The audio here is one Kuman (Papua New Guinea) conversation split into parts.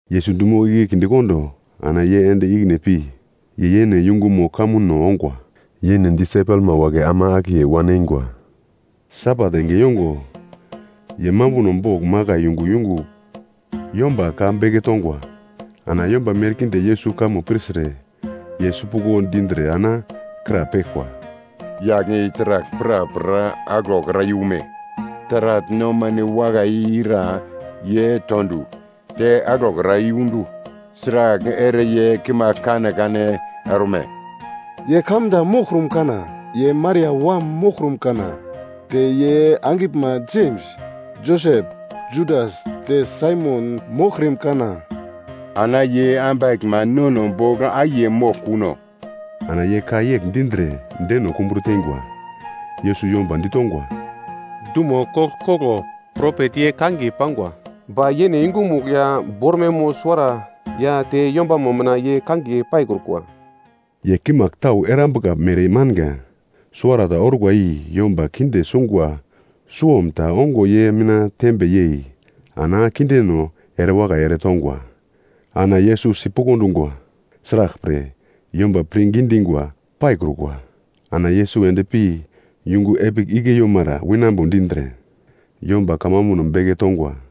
Yesus dumo igle kindekondo ana ye ende ikine pi, ye yene yungumo kamuno ongwa. Yene disaipelma wagle ama akiye wan eingwa. Sabat enge yongo ye mambuno bogl makai yungu yungugl yomba ka beke tongwa. Ana yomba merkinde Yesus kamo pirtre, ye sipuglo dindre ana krapeglkwa, “Yagl i taragl prapra aglokra yume? Taragl nomano wakai i ira ye to du, te aglokra yundu? Sragl ere ye kimagl kanekane orme? Ye kamda moglkrum kana? Ye Maria wam moglkrum kana, te ye angiglma Jems, Josep, Judas te Saimon moglkrim kana? Ana ye ambaglma nono bogl akiye moglkuno?” Ana ye ka yegl dindre deno kumbro teingwa. Yesus yomba ditongwa, “Dumo koglkoglo propet ye kangiye pangwa. Ba yene yungumugl ya bormaimo suwara ya te yombamo mina ye kangiye paikrukwa.” Ye kimagl tau ta erambuka mere manga, suwarata orkwa i yomba kinde sungwa suwom ta ongo ye mina tembe yei ana kindeno erewakai ere tongwa. Ana Yesus sipuglo dungwa, sraglpre, yomba pirngi dingwa paikrukwa. Ana Yesus endpi yungu epigl igle yeimara winambo dindre yomba kamambuno beke tongwa.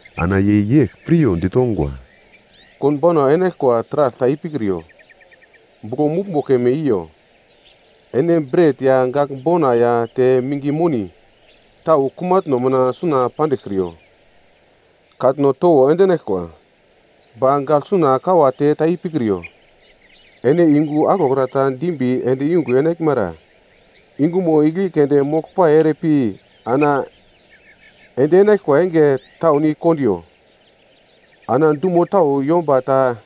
Ana ye yegl piryo ditongwa, “Konbauna enaglkwa taragl ta ipikriyo, buglo muglmbo keme i yo, ene bret ya gagl bona ya te minge moni tau kumatno mina suna pandiglkriyo. Katno towo endinaglkwa, ba gagl suna kawate ta ipikriyo. Ene yungu aglokra ta dimbi ende yungugl enaglmara, yungumo igle keunde moglpai ere pi ana ende enaglkwa enge taun i kondiyo. Ana dumo tau yomba ta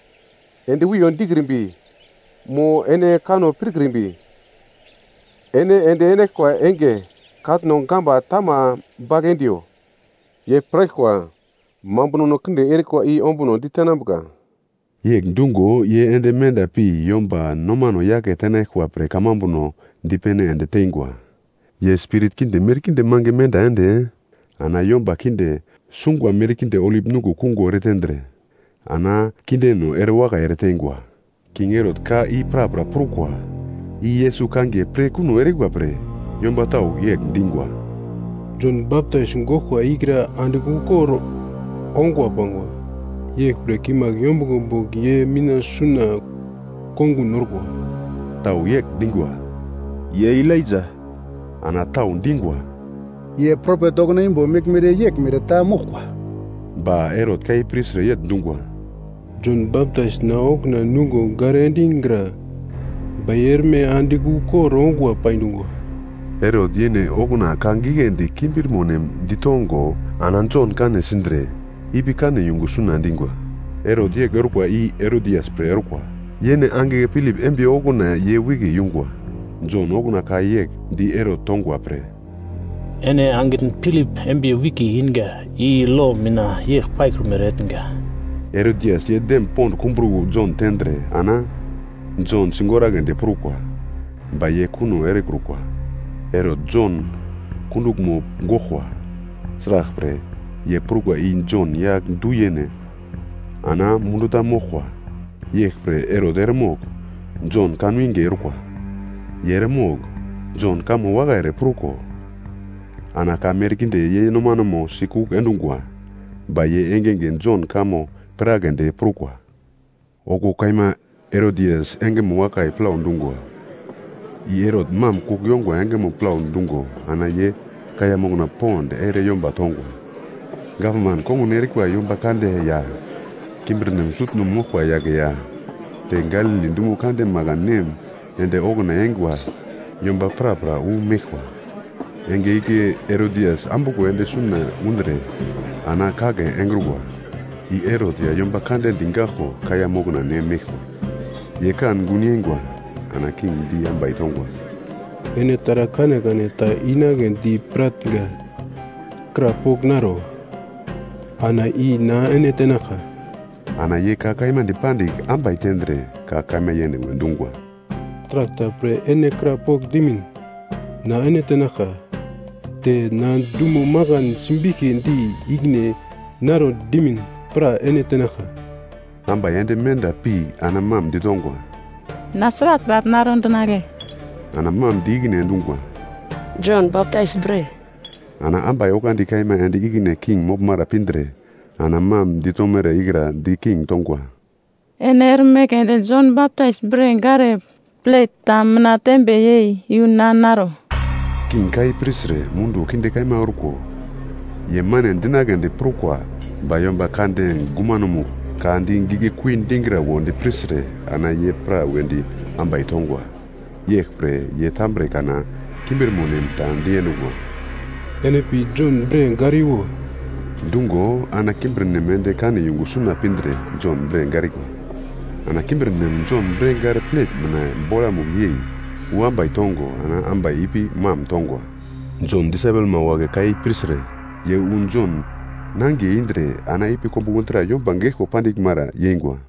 ende wiyo dikrimbi, mo ene kanno pirkrimbi, ene ende enaglkwa enge katno gamba tama bagl endiyo. Ye piraglkwa mambunono kinde erikwa i ombunodi tenambuka.” Yegl dungo ye ende menda pi yomba nomano yake tenaglkwa pre kamambuno dipene ende teingwa. Ye spirit kinde merkinde mange menda ende, ana yomba kinde sungwa merkinde olip nuglo kungo eretendre, ana kindeno erewakai ereteingwa. King Herot ka i prapra prukwa. I Yesus kangiye pir kuno erikwa pre yomba tau yegl dingwa, “Jon Baptais goglkwa ikra andigl ukor ongwa pangwa. Yeglpre kimagl yombuglo bogl ye mina suna kongun orkwa.” Tau yegl dingwa, “Ye Elaija.” Ana tau dingwa, “Ye propet okuna imbo meglmere yeglmere ta moglkwa.” Ba Herot ka i pirtre yegl dungwa, “Jon Baptais na okuna nungo gare endigra. Ba ye erme andigl ukor ongwa pai dungwa!” Herot yene okuna ka giglendi kimbirmo nem ditongo ana Jon kane sindre ipi kane yungu suna endingwa. Herot yegl orkwa i Herodias pre orkwa. Yene angigle Pilip embiye okuna ye wike yungwa. Jon okuna ka yegl di Herot tongwa pre, “Ene angitn Pilip embiye wike inga i lo mina yegl paikrumere etnga.” Herodias ye dem pond kumbro Jon tendre ana ye Jon sigoragledi prukwa. Ba ye kuno erekrukwa. Herot Jon kunduglmo goglkwa, sraglpre, ye prukwa i Jon yagl du-yene, ana holi moglkwa. Yeglpre Herot eremogl Jon kanwinge orkwa. Ye eremogl Jon kamo wakai ere pruko ana ka merkinde ye nomanemo sikugl endungwa. Ba ye engenge Jon kamo piragledi prukwa. Okuwo kaima Herodias engemo wakai plau dungwa. I Herot mam kugl yongwa engemo plau dungo ana ye kaiya mokna pond ere yomba tongwa. Gavman kongun erikwa yomba kande ya kimbirnem sutno moglkwa yagle ya te Galili dumo kande makan nem ende okuna eingwa yomba prapra wu meglkwa. Enge igle Herodias ambuglo ende suna undre ana kagle engrukwa. I Herot ya yomba kande digaglko kaiya mokna ne meglkwa, ye kan gun yeingwa. Ana king di ambai tongwa, “Ene taragl kanekane ta inagledi piratnga, krapogl naro? Ana i na ene tenaglka.” Ana ye ka dipandigl ambai tendre ka kaima yene we dungwa, “Taragl ta pre ene krapogl dimin na ene tenaglka, te na dumo makana simbiglkidi ikine naro dimin pra ene tenaglka.” Ambai ende menda pi ana mam ditongwa, “Na sragl taragl naro dinagle?” Ana mam di ikine endungwa, “Jon Baptais bre.” Ana ambai oglandi kaima ende ikine king moglmara pindre ana mam ditomere ikra di king tongwa, “Ene erme keunde Jon Baptais bre gare plet ta mina tembe yei yu na naro.” King ka i pirtre munduwo kinde kaima orko, ye mane dinagledi prukwa, ba yomba kande gumanomugl ka di giglekui dingra wondi pirtre, ana ye pra wedi ambai tongwa. Yeglpre ye tambre kana kimbirmo nem ta diendungwa, “Ene pi Jon bre gariwo” dungo, ana kimbirnem ende kane yungu suna pindre Jon bre garikwa. Ana kimbirnem Jon bre gare plet ta mina bolamugl yei yu ambai tongo ana ambai ipi mam tongwa. Jon disaipelma wagle ka i pirtre ye wu Jon nangiye indre ana ipi kombuglo dra yomba geglko pandiglmara yeingwa.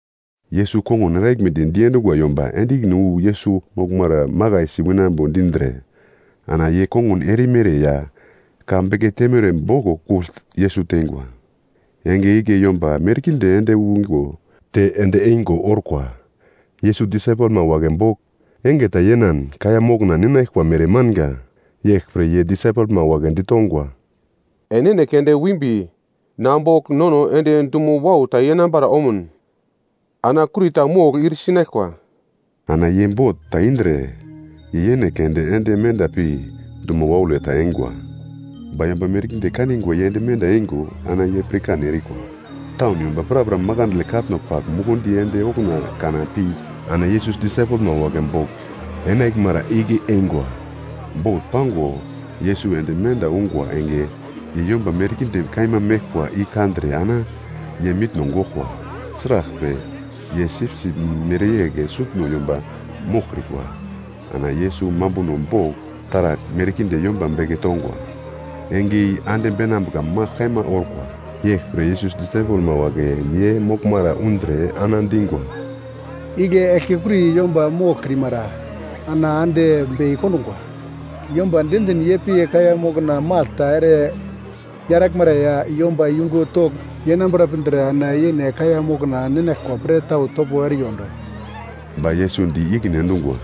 Yesus kongun eraglmedi diendungwa yomba ende ikine wu Yesus moglmara makaisi winambo dindre ana ye kongun erimere ya ka beke teimere boglo kugl Yesus teingwa. Enge igle yomba merkinde ende wingo te ende eingo orkwa. Yesus disaipelma wagle bogl enge ta yenan kaiya mokna ninaglkwa mere manga. Yeglpre ye disaipelma wagle ditongwa, “Enene keunde wimbi na bogl nono ende dumo wau ta yenambara omun ana kurita mogl ir sinaglkwa.” Ana ye bot ta indre, ye yene keunde ende menda pi dumo waule ta eingwa. Ba yomba merkinde kanigwa ye ende eingo ana ye pirkan erikwa. Taun yomba prapra makandle katno pagl mukundi ende okuna kana pi ana Yesus disaipelma wagle bogl enaglmara igle eingwa. Bot pango Yesus ende menda ungwa enge, ye yomba merkinde kaima meglkwa i kandre ana ye mitno goglkwa. Sraglpre, ye sipsip mereyegl sutno yomba moglkrikwa. Ana Yesus mambuno bogl taragl merkinde yomba beke tongwa. Enge i ande beinambuka magl kaima orkwa, yeglpre, Yesus disaipelma wagle ye moglmara undre ana dingwa, “Igle eglkekuri yomba moglkrimara, ana ande bei kondungwa. Yomba diendin ye pi kaiya mokna magl ta ere yaraglmara ya yomba yungu togl yenambara pindre ana yene kaiya mokna ninaglkwa pre tau topo eriyondo.” Ba Yesus di ikine endungwa,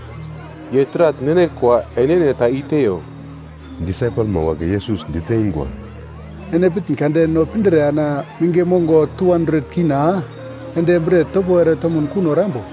“Ye taragl ninaglkwa enene ta i-teiyo.” Disaipelma wagle Yesus diteingwa, “Ene pitn kade no pindre ana minge mongo K200 ende bret topo ere tomun kuno erambo?”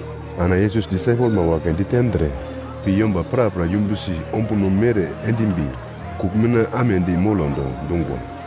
Ana Yesus disaipelma wagle ditendre, pi yomba prapra yumbusi ombuno mere endimbi kugl mina amedi molondo dungwa.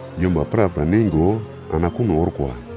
Yomba prapra neingo ana kuno orkwa.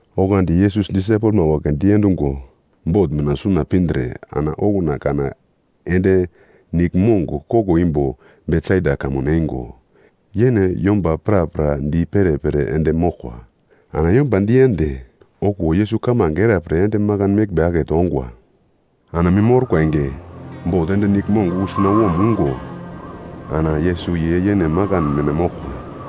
Oglandi Yesus disaipelma wagle diendungo bot mina suna pindre ana okuna kana ende niglmong koglo imbo Betsaida kamun eingo, yene yomba prapra di perepere ende moglkwa. Ana yomba diende, okuwo Yesus kamange era pre ende makan meglmbe akete ongwa. Ana mim orkwa enge, bot ende niglmong wu sunawom ungo ana Yesus ye yene makan mina moglkwa.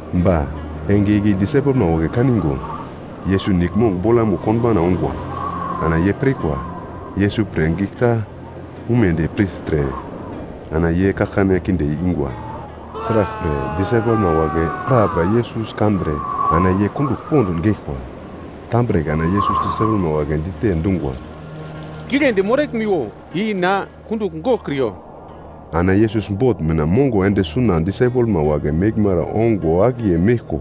Ba enge igle disaipelma wagle kaningo, Yesus niglmong bolamugl konbauna ungwa. Ana ye pirkwa Yesus pre gigl ta umedi pirtre ana ye kaglkane kinde ingwa. Sraglpre disaipelma wagle prapra Yesus kandre ana ye kundugl pond geglkwa. Tambre kana Yesus disaipelma wagle dite dungwa, “Giglendi moraglmiwo. I na, kundugl goglkriyo.” Ana Yesus bot mina mongo ende suna disaipelmo wagle meglmara ongo akiye meglko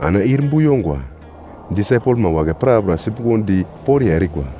ana ir bu yongwa. Disaipelma wagle prapra sipuglodi poriya erikwa,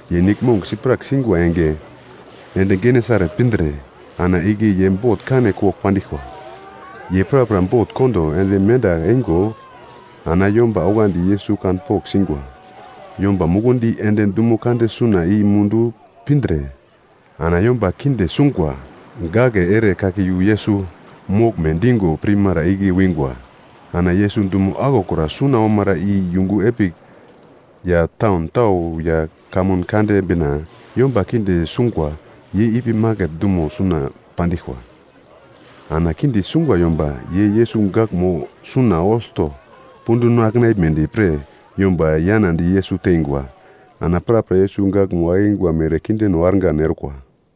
Ye niglmong siprak singwa enge, ende Genesaret pindre ana igle ye bot kane kogl pandiglkwa. Ye prapra bot kondo ende menda eingo ana yomba oglandi Yesus kanpogl singwa. Yomba mukundi ende dumo kande suna i mundu pindre ana yomba kinde sungwa gagle ere kake iyu Yesus moglme dingo pirmara igle wingwa. Ana Yesus dumo aglokra suna omara i yungu epigl ya taun tau ya kamun kande bina, yomba kinde sungwa ye ipi maket dumo suna pandiglkwa. Ana kinde sungwa yomba ye Yesus gaglmo suna olto punduno akenaglmedi pre yomba yanadi Yesus tengwa. Ana prapra Yesus gaglmo akingwa mere kindeno argan orkwa.